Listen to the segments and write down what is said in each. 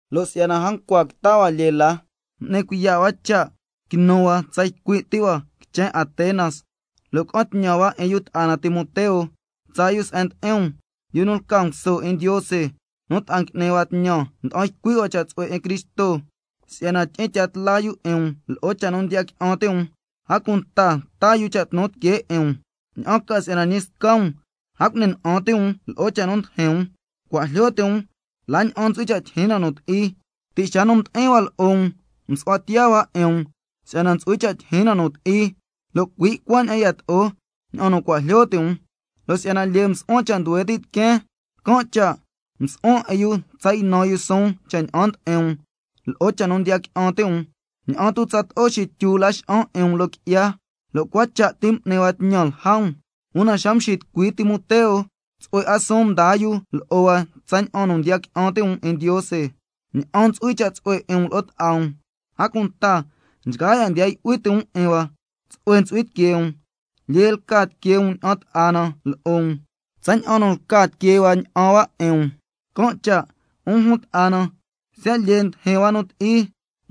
Lo' si'yana a ncua quita hua lyee la, m'ni cuiya' hua cha' quinu hua tsa ycui' ti hua quichen Atenas, lo' ca'an tñan hua 'in yu ta'a na Timoteo tsaa yu se'en ndi'in um, yu nu lca nguso 'in Ndiose, nu ta'a ngui'ni hua tñan nda'an ycui' hua cha' tsu'hue 'in Cristo, si'yana tyi'in tya tla yu 'in um lo'o cha' nu ndiya qui'an ti' um, a cunta taa yu cha' tnu tiquee 'in um, ña'an ca si'yana ñi sca um a cu'ni na'an ti' um lo'o cha' nu ndijin um. Cua' jlyo ti' um la ña'an ntsu'hui cha' tyijyin na nu ti'i, si'yana ti' xa nu mdi'in hua lo'o um msu'hua tiya hua 'in um si'yana ntsu'hui cha' tyijyin na nu ti'i, lo' cui' cuaña'an yato'o ña'an nu cua' jlyo ti' um. Lo' si'yana lyee msu'huan cha' nduhue ti' tiqueen, can' cha' msu'huan 'in nu tsa ynan suun cha' ña'an ndi'in um lo'o cha' nu ndiya qui'an ti' um, ña'an tu' tsato'o xityu Laxa'an 'in um loo qui'ya, lo' cua cha' ti m'ni hua tñan lja um. Una xa mxitucui Timoteo, tsu'hue 'a suun mdaa yu lo'o hua tsaña'an nu ndiya qui'an ti' um 'in Ndiose, ña'an ntsu'hui cha' tsu'hue 'in um lo'o ta'a um, a cunta nchgaa ya' ndiya yu'hui ti' um 'in hua tsu'hue ntsu'hui tiquee um, lyee lca tiquee um ña'an ta'a na lo'o um, tsaña'an nu lca tiquee hua ña'an hua 'in um. Can' cha', 'un jun ta'a na, siya' lyee ndijin hua scasca nu ti'i,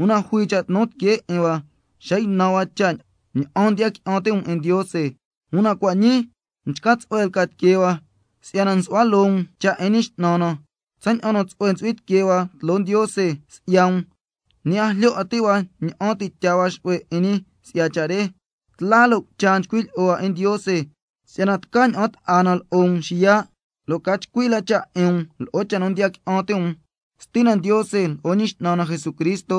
una jui cha' tnu tiquee 'in hua xa ynan hua cha' ña'an ndiya qui'an ti' um 'in Ndiose, una cua' ñii mchca tsu'hue lca tiquee hua, si'yana nsu'hua loo um cha' 'in Ñi X'nan na. Tsaña'an nu tsu'hue ntsu'hui tiquee hua tloo Ndiose si'ya um, ñi a jlyo 'a ti' hua ña'an ti' tyaa hua xu'hue 'in ñi si'ya cha' re. Tla lo' cucha nchcui' lyi'o hua 'in Ndiose si'yana tca ña'an ta'a na lo'o um xiya', lo' ca chcui la cha' 'in um lo'o cha' nu ndiya qui'an ti' um. Stina Ndiose lo'o Ñi X'nan na Jesucristo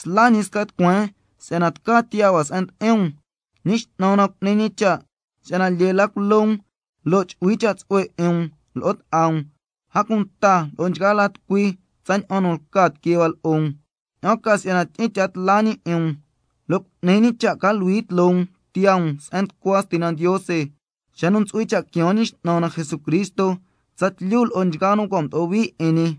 sla ñi sca tucueen si'yana tca tiyaa hua se'en ndi'in um. Ñi X'nan na cu'ni ñi cha' si'yana lyee la culo um lo' chu'hui cha' tsu'hue 'in um lo'o ta'a um, a cunta lo'o nchgaa la tucui, tsaña'an nu lca tiquee hua lo'o um, ña'an ca si'yana tyi'in tya tla la ñi 'in um, lo' cu'ni ñi cha' ca luhui tloo um tiyaa um se'en nducua Stina Ndiose xa nu ntsu'hui cha' quiaan Ñi X'nan na Jesucristo tsatlyu lo'o nchgaa nu cua' mdo'o hui 'in ñi.